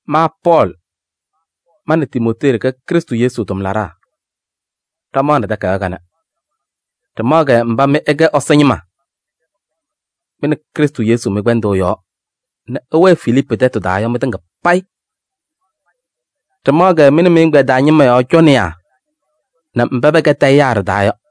Ma Pɔɔlɩ, ma nɛ Timootee ɖɩkɛ Krɩstʋ Yesu tʋmlaɖaa, ɖamaɣnɩ takayaɣ kanɛ. Ɖɩmaɣ-kɛ mba mɩ ɩkɛ Ɛsɔ ñɩma mɩ nɛ Krɩstʋ Yesu mɩ-kpɛndʋʋ yɔɔ nɛ ɩwɛɛ Filiipu tɛtʋ taa yɔ mɩtɩŋa payɩ. Ɖɩmaɣ-kɛ mɩ nɛ mɩ-ɛgbɛyɛ taa ñɩma yɔɔ cɔnɩyaa nɛ mba pɛkɛ tayɩyaa ɖɩ-taa yɔ.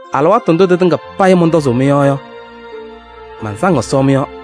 Alɩwaatʋ ndʋ tɩtɩŋa payɩ mɔntɔzʋʋ mɩ-yɔɔ yɔ, mansaŋ Ɛsɔ mɩ-yɔɔ.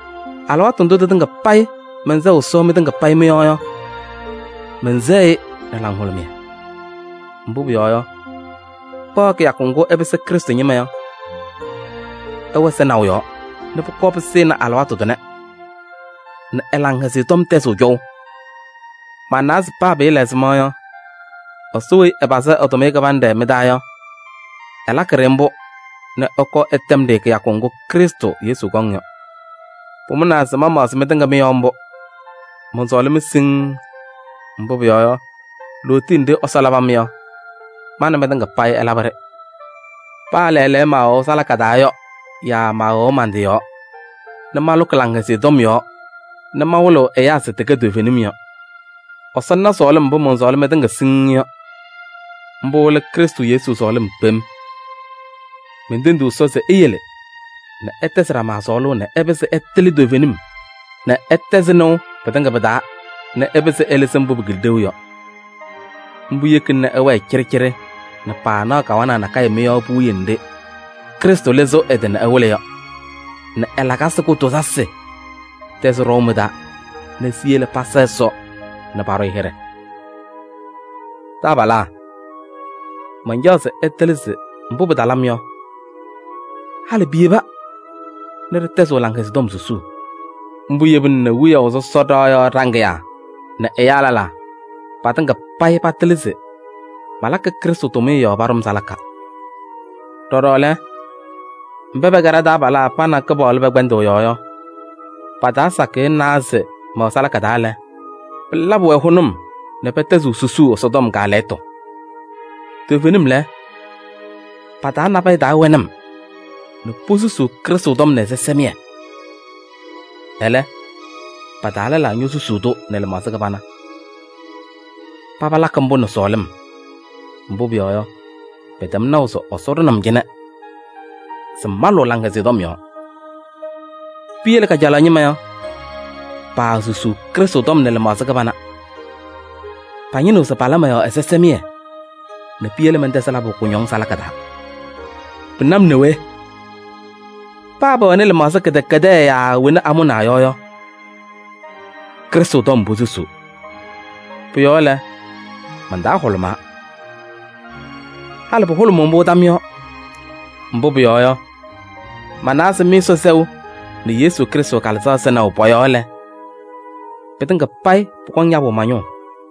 Alɩwaatʋ ndʋ tɩtɩŋa payɩ mɛnsɛɣ Ɛsɔ mɩtɩŋa mɩ-yɔɔ yɔ, mɛnsɛɣ-ɩ nɛ laŋhʋlʋmɩyɛ. Mbʋ pʋyɔɔ yɔ, kpaɣ kɩyakʋ ŋgʋ ɩpɩsɩ Krɩstʋ ñɩma yɔ, ɩwɛ sɩnaʋ yɔɔ nɛ pʋkɔɔ pɩsɩnɩ alɩwaatʋ tʋnɛ nɛ ɛ-Laŋhɛzɩyɛ Tɔm tɛzɩɣ cɔʋ. Manawa se paa pɩɩla ɛzɩma yɔ, Ɛsɔ weyi ɛpazɩ tʋmɩyɛ kɩbanɖɛ mɩ-taa yɔ, ɛlakɩ-ɖɩ mbʋ nɛ ɛkɔɔ ɛtɛm-ɖɩ kɩyakʋ ŋgʋ Krɩstʋ Yesu kɔŋ yɔ. Pʋmʋnaa se mamaɣzɩ mɩtɩŋa mɩ-yɔɔ mbʋ. Mɔnsɔɔlɩ-mɩ siŋŋ, mbʋ pʋyɔɔ yɔ, lootiye nɖɩ Ɛsɔ labɩ-mɩ yɔ, ma nɛ mɩtɩŋa payɩ ɛlabɩ-ɖɩ. Paa lɛɛlɛɛyɔ mɛwɛʋ salaka taa yɔ yaa maawɛʋ man-tɩ yɔɔ nɛ malʋkɩ Laŋhɛzɩyɛ Tɔm yɔɔ nɛ mawɩlɩɣ ɛyaa se tɩkɛ toovenim yɔ. Ɛsɔ na sɔɔlɩm mbʋ mɔnsɔɔlɩ mɩtɩŋa siŋŋ yɔ. Mbʋ lɛ Krɩstʋ Yesu sɔɔlɩm kpem. Mentendiɣ Ɛsɔ se eyele nɛ ɩtɛzɩ ɖama sɔɔlʋʋ nɛ ɩpɩzɩ ɩtɩlɩ toovenim nɛ ɩtɛzɩ nɩʋ pɩtɩŋa pɩ-taa nɛ ɩpɩzɩ ɩlɩzɩ mbʋ pɩkɩlɩ ɖeu yɔ. Mbʋ yekina nɛ ɩwɛɛ cɩɖɩcɩɖɩ nɛ paanaɣ kawanaɣ nakɛyɛ mɩ-yɔɔ puwiye nɖɩ Krɩstʋ lɩzɩɣ ɛ-tɩ nɛ ɛwɩlɩ yɔ nɛ ɛ-lakasɩ kʋtʋʋzasɩ tɛzɩ ɖɔʋ mɩ-taa nɛ siyele pasa Ɛsɔ nɛ paɖʋ-ɩ hɩɖɛ. Taabalaa! Mancaɣ se ɩtɩlɩ se mbʋ pɩtalɩ-m yɔ, halɩ piyeba nɛ ɖɩtɛzɩɣ Laŋhɛzɩyɛ Tɔm susuu. Mbʋ yebina nɛ wiyaʋ sɔsɔ ɖɩɣa yɔɔ ɖaŋɩyaa nɛ ɛyaa lɛlaa, patɩŋa payɩ patɩlɩ se malakɩ Krɩstʋ tʋmɩyɛ yɔɔ paɖʋ-m salaka. Ɖɔɖɔ lɛ, mba pɛkɛ ɖa-taabalaa pa nɛ Kɩpaɣlʋ pɛ-kpɛndʋʋ yɔɔ yɔ, pa-taa sakɩyɛ nawa se mɛwɛ salaka taa lɛ, pɩlabɩ-wɛ hʋnʋm nɛ pɛtɛzɩɣ susuu Ɛsɔtɔm kaalɛyɩtʋ. Toovenim lɛ, pa-taa nabɛyɛ taa wɛnɩ-m nɛ posusuu Krɩstʋ tɔm nɛ ɛzɩsɛmɩyɛ. Ɛlɛ, pa-taa lɛlaa ñosusaɣ-tʋ nɛ lɩmaɣza kɩbana. Paba lakɩ mbʋ nɛ sɔɔlɩm, mbʋ pʋyɔɔ yɔ, pɛtɛm naʋ se Ɛsɔ ɖʋnɩ-m cɩnɛ se malʋ Laŋhɛzɩyɛ Tɔm yɔɔ. Piyele kajalaɣ ñɩma yɔ, paasusuu Krɩstʋ tɔm nɛ lɩmaɣza kɩbana. Pañɩnɩɣ se pala mɔ-yɔɔ ɛzɩsɛmɩyɛ nɛ piyele mɛntɛzɩ labʋ kʋñɔŋ salaka taa. Pɩna-m nɛ we! Paa pɛwɛnɩ lɩmaɣza kɩdɛkɛdɛɛ yaa wena amʋnaa yɔ yɔ, Krɩstʋ tɔm posusuu. Pʋ-yɔɔ lɛ, man-taa hʋlʋmaa. Halɩ pʋhʋlʋmʋʋ mbʋ tam yɔɔ. Mbʋ pʋyɔɔ yɔ, manawa se mɩ-Ɛsɔ sɛʋ nɛ Yesu Krɩstʋ Kalɩzaɣ sɩnaʋ pɔ-yɔɔ lɛ, pɩtɩŋa payɩ pʋkɔŋ yabʋ ma-ñʋʋ.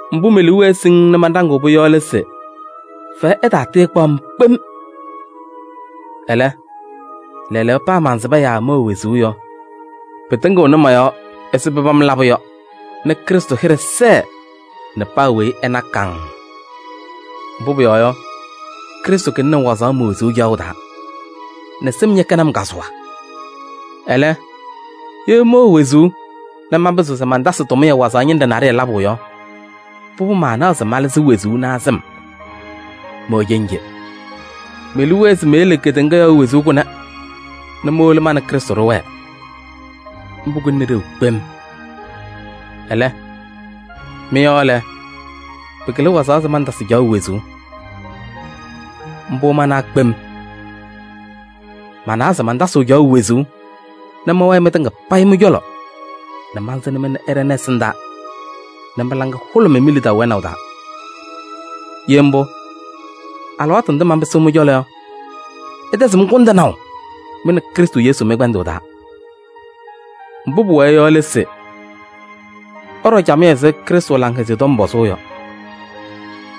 Mbʋ me-liu wɛɛ siŋŋ nɛ manɖaŋ-pʋ yɔ lɛ se fɛyɛ ɛtaatɩɩkpaʋ-m kpem. Ɛlɛ, lɛɛlɛɛyɔ paa mansɩba yaa mɛwɛ wezuu yɔ, pɩtɩŋɩɣnɩ mɔ-yɔɔ ɛzɩ pɩpam labʋ yɔ nɛ Krɩstʋ hɩɖɛ sɛɛ nɛ paa weyi ɛna kaŋŋ. Mbʋ pʋyɔɔ yɔ, Krɩstʋ kɩlɩnɩ-m wazaɣ me-wezuu caɣʋ taa nɛ sɩm ñɛkɛnɩ-m kazʋwa. Ɛlɛ, ye mɛwɛ wezuu nɛ manpɩzɩɣ se mantasɩ tʋmɩyɛ wazaɣ ñɩnɖɛ naɖɩyɛ labʋ yɔ, pʋbʋ maanaɣ se malɩzɩ wezuu naa sɩm. Mɛwɛ cenje: me-liu wɛɛ se meyele kedeŋa yɔɔ wezuu kʋnɛ nɛ mowolo ma nɛ Krɩstʋ ɖɩwɛɛ. Mbʋ kɩlɩnɩ ɖeu kpem. Ɛlɛ, mɩ-yɔɔ lɛ, pɩkɩlɩ wazaɣ se mantasɩ caɣʋ wezuu. Mbʋ manawa kpem. Manawa se mantasɩɣ caɣʋ wezuu nɛ mɛwɛɛ mɩtɩŋa payɩ mɩ-cɔlɔ nɛ mansɩnɩ-mɩ nɛ ɩɖɛnɩ ɛsɩndaa nɛ mɩ-laŋa hʋlʋmɩ mi-lidaʋ wɛnaʋ taa. Ye mbʋ, alɩwaatʋ ndʋ manpɩsɩɣ mɩ-cɔlɔ yɔ, ɩtɛzɩɣ-m kʋndɩnaʋ mɩ nɛ Krɩstʋ Yesu mɩ-kpɛndʋʋ taa. Mbʋ pʋwɛɛ yɔ lɛ se: ɩɖɔ camɩyɛ ɛzɩ Krɩstʋ Laŋhɛzɩyɛ Tɔm pɔzʋʋ yɔ.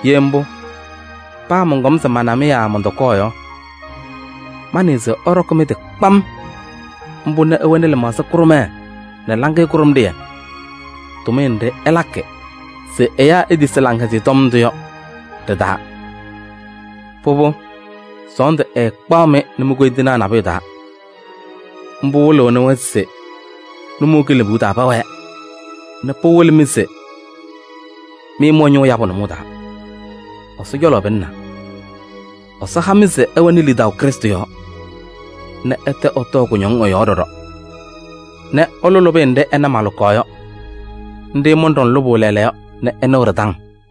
Ye mbʋ, paa mɔnkɔm se mana-mɩ yaa mɔntɔkɔɔ yɔ, manɩɩ se ɩɖɔkɩ mɩ-tɩ kpam mbʋ nɛ ɩwɛnɩ lɩmaɣza kʋɖʋmɛɛ nɛ laŋɩyɛ kʋɖʋmɖɩyɛ, tʋmɩyɛ nɖɩ ɩlakɩ se ɛyaa etisi Laŋhɛzɩyɛ Tɔm ndʋ yɔ ɖɩ-taa. Pʋbʋ, sɔɔndʋ ɛɛkpaɣ-mɩ nɛ mi-koyindinaa nabʋyʋ taa. Mbʋ wɩlɩɣnɩ-wɛ se nʋmɔʋ kilebuu taa pɛwɛɛ nɛ pɩwɩlɩ-mɩ se mɩ mɩwɛ ñʋʋ yabʋ nʋmɔʋ taa, Ɛsɔ cɔlɔ pɩlɩnaa. Ɛsɔ ha-mɩ se ɩwɛnɩ lidaʋ Krɩstʋ yɔɔ nɛ ɩtɛ ɩtɔɔ kʋñɔŋ ɛ-yɔɔ ɖɔɖɔ nɛ ɩlʋ lʋbɩyɛ nɖɩ ɩna malʋkaɣ yɔ. Nɖɩ mɔnɖɔŋ lʋbʋ lɛɛlɛɛyɔ nɛ ɩnɩɣ ɖɩ-taŋ.